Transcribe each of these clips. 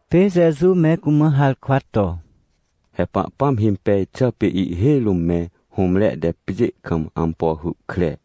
Pê Jeju me cumã harkwa to: — He Pahpãm himpej xà pê ihhêj rũm me hũmre te pjê kam ampo hy kre.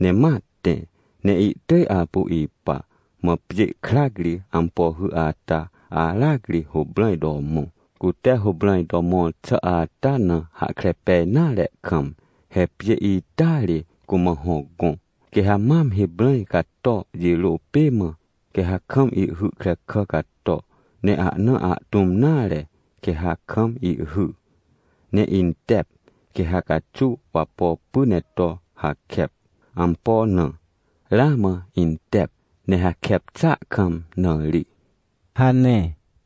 Ne ma tẽ ne ihtỳj apu ipa. Mã pjê krac ri ampo hy ata aracri huprãj to mõ, cute huprãj to mõr xà ata na hahkre pej nare kam. He pjê ita ri cumã hô gõ, quê ha mam hiprãj cato, jirô pê mã, quê ha kam ihhy krekà cato, ne ahna ahtũm nare quê ha kam ihhy, ne intep, quê ha caxuw wapo py ne to hakep. Ampo na? Ramã intep ne hakep xàa kam na ri — hane.